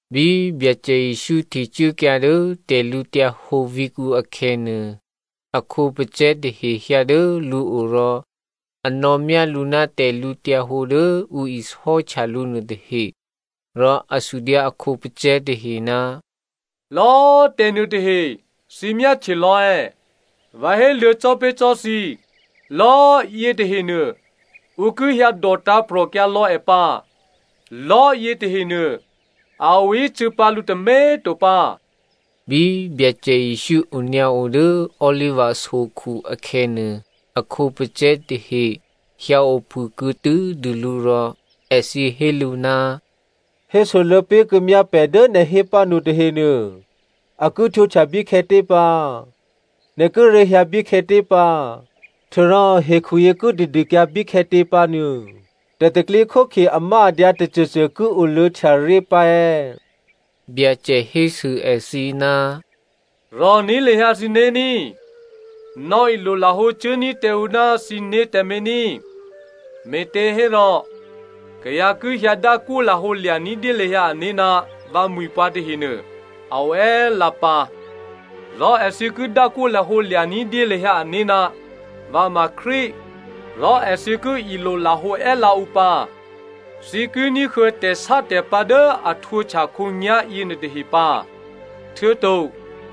Bí Byacè Jesǔ htecuốkyǎ dố tè̤lǔhǒdu vǐ̤kǔ akhè̌nuô, a khǒpacè̤̌ tahe hyǎ dố lǔo rò a nò̌myá lǔ ná tè̤lǔhǒdu dố ǔ isò́htya lǔ nuôtahe. Rò a sudyǎ a khǒpacè̤̌ tahe, “Lò̌꤮ tè̤nuô tahe thǐ myáhtye lò̌ è̌? Vǎ héluô̌ cò́ pé̤ cò́ thǐ, lò̌꤮ yě tahenuô, ǔ ki hyǎ dòtǎ̤prò̤kyǎ lò̌ è pǎ. Lò̤́ yětahenuô a oícû̌ pǎ lǔ tômě꤮ to pǎ.” Bí Byacè Jesǔ onyǎo dố Oliva sokhu akhè̌nuô, a khǒpacè̤̌ tahe hyǎophûkuô̌ tû́dû lǔ rò èthǐ hé lǔ, “Hésoluô̌ pé̤kuô̌myá pè̤ dố nè̤ hé pǎnu tahenuô, a ki htwǒhtya bíkhè̌tě pǎ? Nè̤ kíré̤ hyǎ bíkhè̌tě pǎ htuô̌rò hekhuyě ki tadûkyǎ bíkhè̌tě pǎnuô tè̤pro̤tè̤prya̤ amáadyǎ tôcôcô ki oluô̌htya ré̤ pǎ è̌?” Byacè hésû èthǐ, “Rò̤ní̤ lahyǎ thǐné̤ ní꤮, nò̌ilolahǒ cuốní̤ tǎ ǔ ná thǐné̤ tǎmé̤ ní꤮. Me̤těhérò kayǎ ki hyǎdákwó lahǒlya̤ ní̤dyé lahyǎ ané̤ ná vǎmwi̤ pǎ tahenuô a o è́lǎ pǎ, rò èthǐ ki dákwó lahǒ lya̤ ní̤dyé lahyǎ ané̤, ‘Vǎ ma Krístu’ rò èthǐ ki ilolahǒ è́lǎ ǔ pǎ. Thǐ ki ní̤huô̌ tè̤sátè̤pǎ̤ dố a htwǒhtya khǒnyá̤ yěnuôtahe pǎ, htuô̌to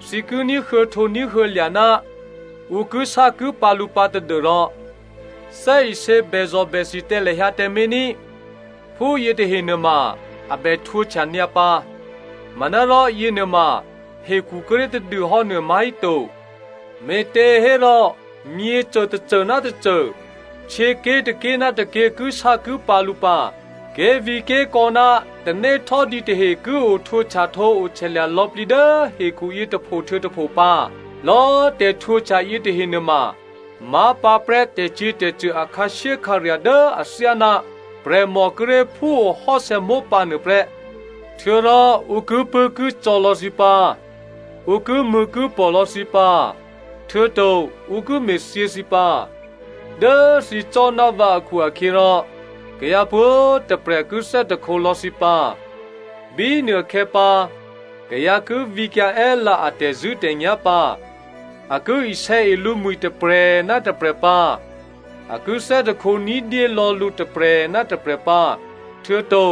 thǐ ki ní̤huô̌htǒ ní̤huô̌lya̤ ná ǔ kisákipǎ̤ lǔ pǎ tadû́rò thè́isě bèzò̤bèthi tǎ lahyǎ tǎmé̤ ní꤮. Phúyě tahe nuôma a bè htwǒhtya nyǎ pǎ, manárò yěnuôma hekhu kíré̤ tadû hò́nuô má̤híto. Me̤těhérò myěcô tôcô ná tôcô, htyěké̤ tôké̤ ná tôké̤ kisákipǎ̤ lǔ pǎ. Ké̤vǐ̤ké̤kò̌ ná tanéhtò́dǐ tahe ki ohtyahtǒohtyalya̤ lò̌plǐ dố hekhuyě tôpho htuô̌ tôpho pǎ. Lò̌꤮ tè̤htwǒhtya yětahe nuôma má̤pǎprè́ tè̤cyě̤tè̤cṳ̂ a khǎshyékhǎrya̤ dố athyáná prè̤mò kíré̤ phúo hò́sè̌ mópǎ nuôprè́. “Htuô̌rò ǔ kipṳ̂́kicò̌ lò̌ thǐ pǎ, ǔ kimṳ̂̌kipò̤ lò̌ thǐ pǎ htuô̌to ǔ ki me̤thyě thǐ pǎ. Dố thǐ cò́ ná vǎ akhu-akhyěrò kayǎ pwǒ̤꤮ tôprè̤ ki thè́hte lò̌ thǐ pǎ. Bínuôkhè̌ pǎ kayǎ ki vǐkyǎ è́lǎ a tè̤zṳ̂́tè̤nyá̤ pǎ. A ki isè̌e lǔmwi̤ tôprè̤ ná tôprè̤ pǎ. A ki thè́hte ní̤dyé lò̌ lǔ tôprè̤ ná tôprè̤ pǎ. Htuô̌to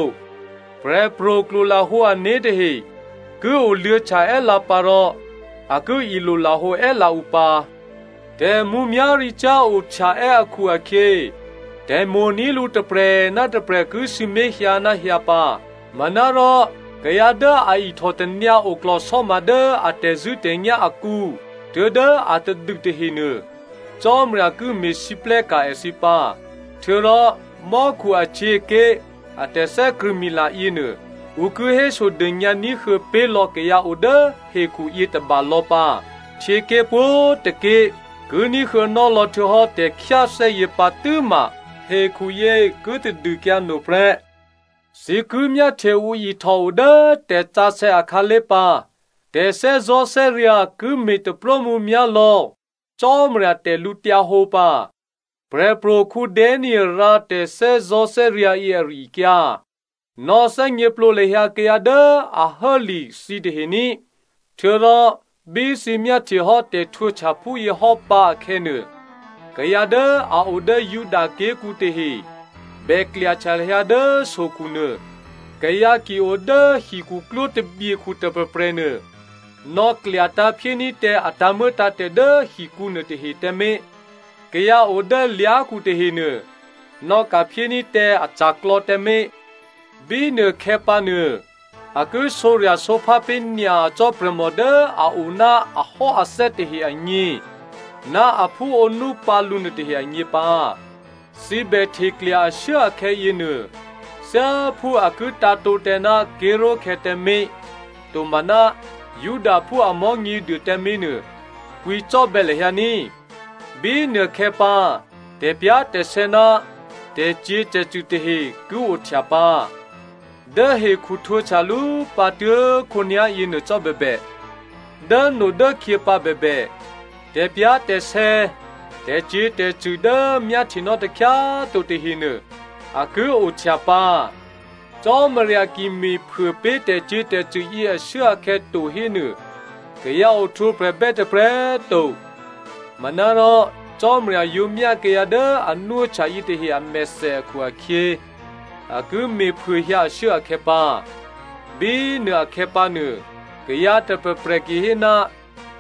prè̤pro̤ klwolahǒ ané̤ tahe ki oluô̌htya è́lǎ pǎ rò a ki ilolahǒ è́lǎ ǔ pǎ. Tè̤mǔmyá̤ricyá̤ ohtyaè́ akhu-akhyě, tè̤mo̤ní̤ lǔ tôprè̤ ná tôprè̤ ki sǐmé̤ hyǎ ná hyǎ pǎ. Manárò kayǎ dố a ihtòtanyǎ oklò̤sò́ma dố a tè̤zṳ̂́tè̤nyá̤ akǔ tuố̤dố atadû tahenuô Cò́marya ki me̤lwóhteka̤ èthǐ pǎ. Htuô̌rò mò́khu ahtyěké̤ a tè̤thè́krṳ̂̌mila yěnuô, ǔ ki hésodônyǎ ní̤huô̌ pé̤lò̌ kayǎ o dố hekhuyě tôba lò̌ pǎ, htyěké̤ pwǒ̤tôké̤ ki ní̤huô̌nò́ lò̌htuô̌hò́ tè̤khyáthè́yě pǎ tû́ma hekhuyě ki tadûkyǎ no prè́.” “Thǐ ki myáhtye ǔ ihtòo dố tè̤sǎsè̌ akhǎlé̤ pǎ. Tè̤thè́zò̤́thè́ryǎ̤ ki me̤ taprómǔmyá̤ lò̌ Cò́marya tè̤lǔhǒdu pǎ. Prè̤pro̤ Danielè rǎ tè̤thè́zò̤́thè́ryǎ̤ yě ari-akyǎ. Nò̌ thè́gněplǒ lahyǎ kayǎ dố a hố li thǐtahe ní꤮. Htuô̌rò bí thǐ myáhtyehò́ tè̤htwǒhtya phúyě hò́ pǎ akhè̌nuô, kayǎ dố a o dố Juda ké̤kǔ tahe bè klyahtya lahyǎ dố sokhunuô. Kayǎ ki o dố hikhuklwó tabyekhu tôprè̤prè̤ nuô nò̌klyatǎ̤ phyéní̤ tǎ a tǎ̤muô̌tǎ̤tè̤ dố hikǔ nuôtahe tǎmé̤. Kayǎ o dố lyá̤khu tahenuô nò̌ka̤ phyéní̤ tǎ aca̤klò̌ tǎmé̤. Bínuôkhè̌pǎ nuô a ki sǒrya̤sǒphá pé̤ nyacò́ prè̤mò dố a o ná ahò́athè́ tahe agně ná aphú ǒnú pǎlǔ nuôtahe agně pǎ. Thǐ bè hteklya ashuốakhè̌ yěnuô, thyáphú a ki tǎ̤tǒ tǎ ná ké̤ró̤khè̌ tǎmé̤ tomaná Judaphú a Mò̤́nyěduô tǎmé̤nuô, kwǐcò́bè̌ lahyǎ ní꤮. Bínuôkhè̌pǎ tè̤pyá̤tè̤sè̌ ná tè̤cyě̤tè̤cṳ̂ tahe ki ohtya pǎ. Dố hekhu htwǒhtyalú pǎ tuố̤khǒnyá̤ yěnuô cò́ bèbè, dốnodốkhyě pǎ bèbè, tè̤pyá̤tè̤sè̌, tè̤cyě̤tè̤cṳ̂ dố myáhtyenò́ takhyá꤮ to tahenuô, a ki ohtya pǎ. Cò́marya ki me̤phuô pé̤ tè̤cyě̤tè̤cṳ̂ yě ashuốakhè̌ to hénuô, kayǎ ohtwǒprè̤bè́ tôprè̤ to. Manárò Cò́marya yǒ myá kayǎ dố a nwóhtya yětahe amèthè akhu-akhyě, a ki me̤phuôhyǎ ashuốakhè̌ pǎ. Bínuôakhè̌pǎ nuô, kayǎ tôprè̤prè̤ ki hé,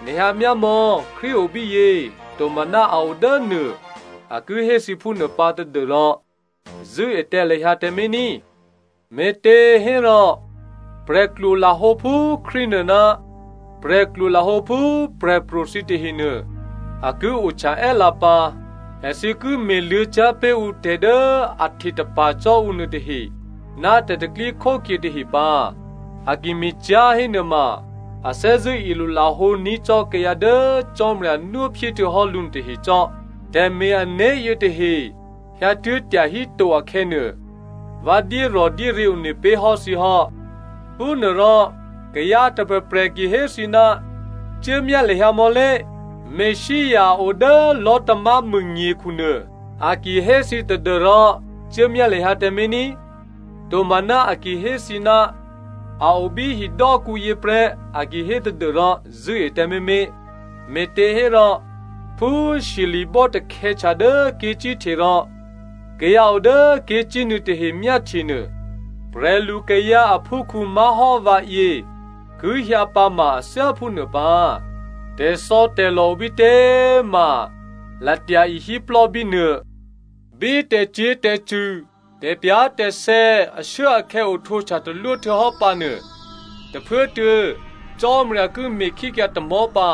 ‘Nè̤ hyǎ myámò̌, Krístu obíyě,’ tomaná ‘A o dốnuô,’ a ki hé thǐ phúnuô pǎ tadû́rò zṳ̂́e tǎ lahyǎ tǎmé̤ ní꤮. Me̤těhérò prè̤klwo lahǒ phú Krístunuô ná prè̤klwo lahǒ phú prè̤pro̤ thǐ tahenuô a ki ohtya è́lǎ pǎ. Èthǐ ki me̤luô̌ cyá̤ pé̤ ǔ tè̤ dố a htetapa̤ cò́ ǔ nuôtahe ná tè̤pro̤tè̤prya̤ tahe pǎ. A ki me̤cyá̤ hénuôma a thè́zṳ̂́ ilolahǒ ní̤ cò́ kayǎ dố Cò́marya nwóphyé htuô̌hò́ lǔ nuô tahecò́. Tè̤me̤-ané̤ yětahe hyǎtuố̤ tyahíto akhè̌nuô, vǎ dyérò̤dyéryě̤ one pé̤ hò́ thǐ hò́. “Phúnuôrò kayǎ tôprè̤prè̤ ki hé thǐ, ‘Cuốmyá lahyǎ mò̌lé, Messia odố lò̤́tamámû nyekhu nuô,’ a ki hé thǐ tadû́rò cuốmyá lahyǎ tǎmé̤ ní꤮. Tomaná a ki hé thǐ, ‘A o bí hidò́kǔ yě prè́,’ a ki hé tadû́rò zṳ̂́e tǎmé̤mé̤. Me̤těhérò phú shyeli̤bò́ takhè̌htya dố ké̤cíhte rò kayǎ o dố ké̤cínuô̌ tahe myáhtyenuô, prè̤lukayǎ aphúkhǔ má̤hò́ vǎyě ki hyǎ pǎ ma a thyá phúnuô pǎ. Tè̤thò̌tè̤lò̤ obítě꤮ ma latya ihíplò́ bínuô.” “Bí tè̤cyě̤tè̤cṳ̂, tè̤pyá̤tè̤sè̌ ashuốakhè̌ ohtwǒhtya talwó htuô̌hò́ pǎnuô, tôphuốtuô̌ ‘Cò́marya ki me̤khíkyǎ tamò̤́ pǎ.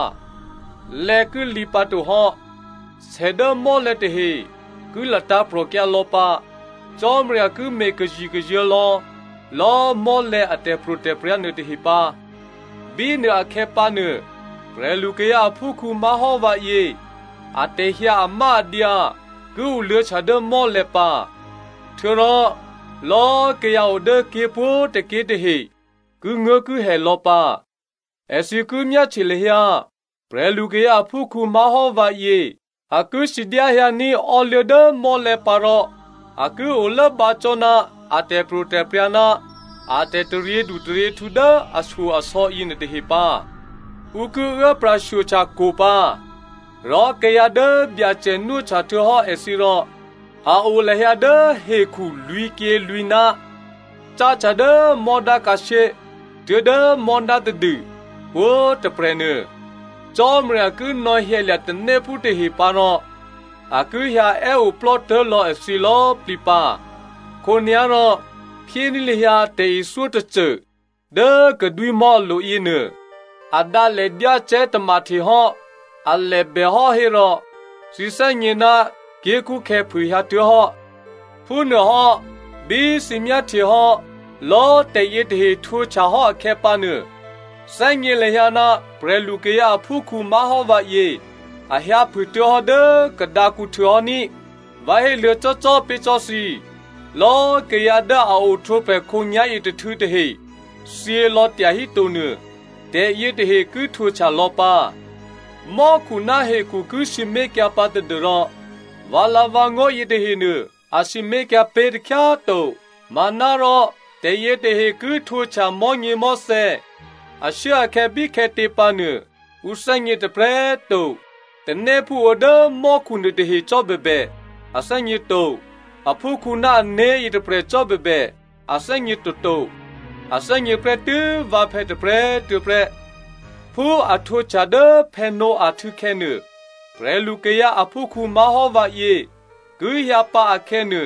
Lè̌ ki lǐ pǎtohò́. Sè dố mò́lè̤̌ tahe ki latǎ̤prò̤kyǎ lò̌pǎ. Cò́marya ki me̤ kazikazuô̤̌ lò̌lò̌꤮ mò́lè̤̌ a tè̤pro̤tè̤prya̤ nuôtahe pǎ.’ “Bínuôakhè̌ pǎnuô, prè̤lukayǎ aphúkhǔ má̤hò́ vǎyě atè̤hyǎ amáadyǎ ki oluô̌htya dố mò́lè̤̌ pǎ. Htuô̌rò lò̌꤮ kayǎ o dố ké̤ pwǒ̤tôké̤ tahe kinguố̤kihè lò̌ pǎ. Èthǐ ki myáhtye lahyǎ prè̤lukayǎ aphúkhǔ má̤hò́ vǎyě a ki sidyáhyǎní̤ ò́luố̤ dố mò́lè̤̌ pǎ rò a ki olốbǎ cò́ ná a tè̤pro̤tè̤prya̤ ná a tè̤taryědu taryěhtǔ dố ashyo-asò̌ yěnuôtahe pǎ. Ǔ ki uố pra̤shyohtya kwo̤ pǎ. Rò kayǎ dố Byacè nwóhtya htuô̌hò́ èthǐ rò a o lahyǎ dố hekhu lwǐ̤kyělwǐ̤ná̤, cáhtya dố mò́dá khǎshyé tuố̤dố mò́dá tadû pwǒ̤꤮ tôprè̤nuô, Cò́marya ki nò̌hyǎlya̤ tanéphú tahe pǎ rò a ki hyǎè́oplò́ tố̤lò̌ èthǐ lò̌꤮ plǐ pǎ. “Khǒnyá̤rò phyéní̤ lahyǎ tè̤ithyó tôcô dố kadwímò̤́ alo̤ yěnuô. A dǎ lè dyácè̤́ tamahtehò́, alè bèhò́ hérò thǐ thè́gně ná ké̤kṳ́khè̌ phûhyǎ tuố̤hò́. Phúnuôhò́ bí thǐ myáhtyehò́ lò̌꤮ tè̤yě tahe htwǒhtyahò́ akhè̌pǎnuô, thè́gně lahyǎ ná prè̤lukayǎ aphúkhǔ má̤hò́ vǎyě a hyǎphûtuố̤hò́ dố kadǎkǔhtû̌ hò́ ní꤮. Vǎ héluô̌ cò́cò́꤮ pé̤ cò́ thǐ, lò̌꤮ kayǎ dố a ohtwǒprè̤ khǒnyá̤yětôhtû̌ tahe thyělò̌ tyahíto nuô, tè̤yětahe ki htwǒhtya lò̌ pǎ. Mò́khu ná hekhu ki sǐmé̤kyǎ pǎ tadû́rò vǎlǎ̤vǎngó̤ yětahenuô a sǐmé̤kyǎ pé̤ takhyá꤮ to. “Manárò tè̤yětahe ki htwǒhtya mò̤́nyěmò̤́thè̌, ashuốakhè̌ bíkhè̌tě pǎnuô ǔ thè́gně tôprè̤꤮ to. Tanéphú o dố mò́khu nuôtahe cò́ bèbè a thè́gně to. Aphúkhǔ ná ané̤ yětôprè̤ cò́꤮ bèbè, a thè́gně toto. A thè́gně prè́tû́ vǎphè̌ tôprè̤꤮ tuô̌prè́. Phú a htwǒhtya dố Noah htû̌khè̌nuô, prè̤lukayǎ aphúkhǔ má̤hò́ vǎyě ki hyǎpǎ akhè̌nuô,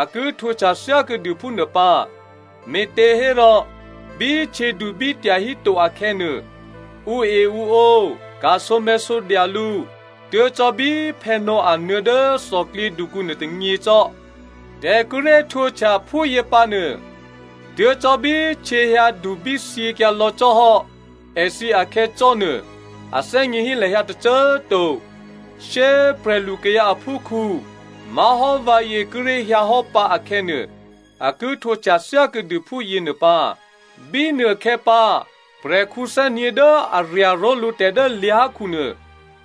a ki htwǒhtya thyákuô̌dû phúnuô pǎ. Me̤těhérò bí htyědubí tyahíto akhè̌nuô, ǔeǔǒ, ka̤sǒmè̤̌sǒdya lǔ tuố̤ cò́ bí Noah nuô̌ dố thòklyědukǔ nuôtônyě cò́. Tè̤ kíré̤ htwǒhtya phúyě pǎnuô, tuố̤ cò́ bí htyěhyǎ dubí thyěkyǎ lò̌ cò́hò́ èthǐ akhè̌ cò́ nuô꤮, a thè́gněhí lahyǎ tôcô꤮ to. Shyé꤮ prè̤lukayǎ aphúkhǔ má̤hò́ vǎyě kíré̤ hyǎhò́ pǎ akhè̌nuô, a ki htwǒhtya thyákuô̌dû phúyěnuô pǎ. Bínuôkhè̌pǎ, prè̤khǔ thè́nyě̤ dố a rya̤ ró̤lǔ tè̤ dố lyá̤khu nuô,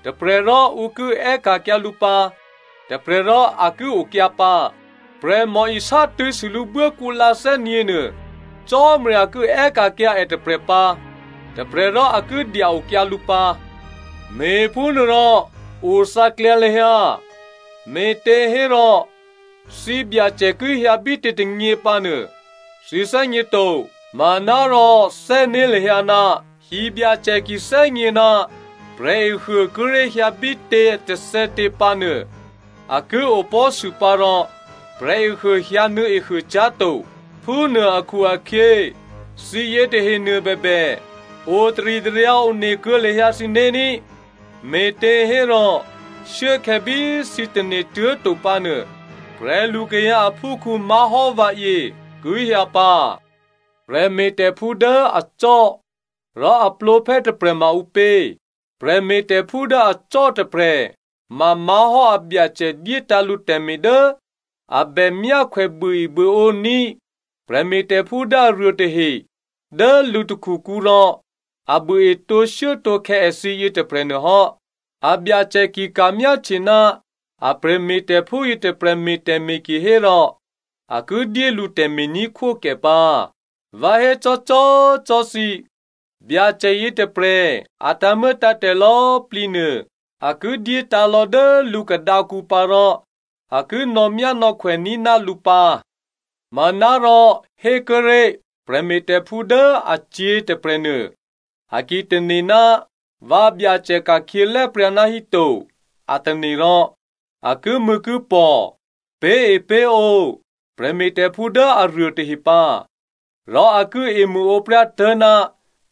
tôprè̤ rò ǔ ki è́ka̤kyǎ lǔ pǎ, tôprè̤ rò a ki okyǎ pǎ. Prè̤mò isátṳ̂̌sû lǔ buốkǔlǎ thè́nyě̤nuô, Cò́marya ki è́ka̤kyǎ è tôprè̤ pǎ. Tôprè̤rò a ki dya-okyǎ lǔ pǎ. “Me̤phúnuôrò othǎklyǎ lahyǎ, me̤těhérò thǐbyacè ki hyǎ bítě tônyě pǎ nuô thǐ thè́gně to. Manárò thè́né̤ lahyǎ, hibyacè ki thè́gně ná prè̤ehuô kíré̤ hyǎ bítě tôthè̌tě pǎ hénuô, a ki opò̤́sû pǎ rò prè̤ehuô hyǎnuô̌ ehuôcyá̤to. Phúnuô akhu-akhyě, thǐ yětahenuô bèbè, otaritaryǎ one kuô̌ lahyǎ thǐné̤ ní꤮, me̤těhérò shuốkhè̌ bí thǐ tane̤tuố̤ to pǎnuô, prè̤lukayǎ aphúkhǔ má̤hò́ vǎyě ki hyǎ pǎ. “Prè̤me̤tè̤phú dố acò́ rò a plǒphè́ tôprè̤ma ǔpě? Prè̤me̤tè̤phú dố acò́ tôprè̤ mamá̤hò́ abyacè dyétǎ̤ lǔ tè̤me̤ dố a bè myákhwè buôebuôǒní̤ prè̤me̤tè̤phú dố aruô tahe dố lǔ takhukǔ rò a buôe tǒshuốtǒkhè̌ èthǐ yětôprè̤nuô hò́. Abyacè ki ka̤myáhtye ná a prè̤me̤tè̤phú yětôprè̤ me̤ tè̤me̤ kihérò a ki dyé lǔ tè̤me̤ní̤khwókè pǎ. Vǎ hécò́cò́꤮ cò́ thǐ, Byacè yětôprè̤ a tǎ̤muô̌tǎ̤tè̤ lò̌꤮ plǐnuô a ki dyétǎ̤lò̌ dố lǔ khadǎkǔ pǎ rò a ki nò̌myánò̌khwè ní̤ ná lǔ pǎ. Manárò hékuốré̤ prè̤me̤tè̤phú dố acyě̤ tôprè̤nuô, a ki tane̤, ‘Vǎbyacè ka̤khyě lè̤́pryǎ ná híto,’ a tane̤ rò, a kimṳ̂̌kipò̤, pé̤epé̤ǒ prè̤me̤tè̤phú dố aruô tahe pǎ, rò a ki emṳ̂ǒpryá tố̤ná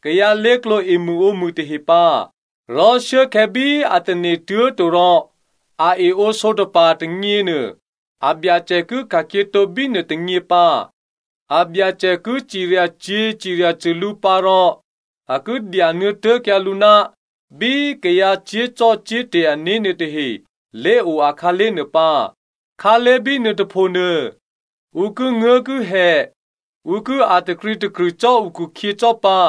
kayǎ lé̤klǒ emṳ̂ǒmṳ̂ tahe pǎ. Rò shuốkhè̌ bí a tane̤ tuố̤to rò a eǒsǒtapa̤ tônyěnuô, abyacè ki ka̤khyětǒ bínuô tônyě pǎ. Abyacè ki ciryacyě̤ ciryacṳ̂ lǔ pǎ rò a ki dyanuô̌ tố̤kyǎ lǔ ná bí kayǎ cyé̤zò́cò́te̤ ané̤ nuôtahe lé̤o akhǎlé̤ nuô pǎ. Khǎlé̤ bínuô tôphonuô ǔ kinguố̤kihè, ǔ ki a̤ takrǐtakrṳ̂ cò́ ǔkhukhyě cò́ pǎ.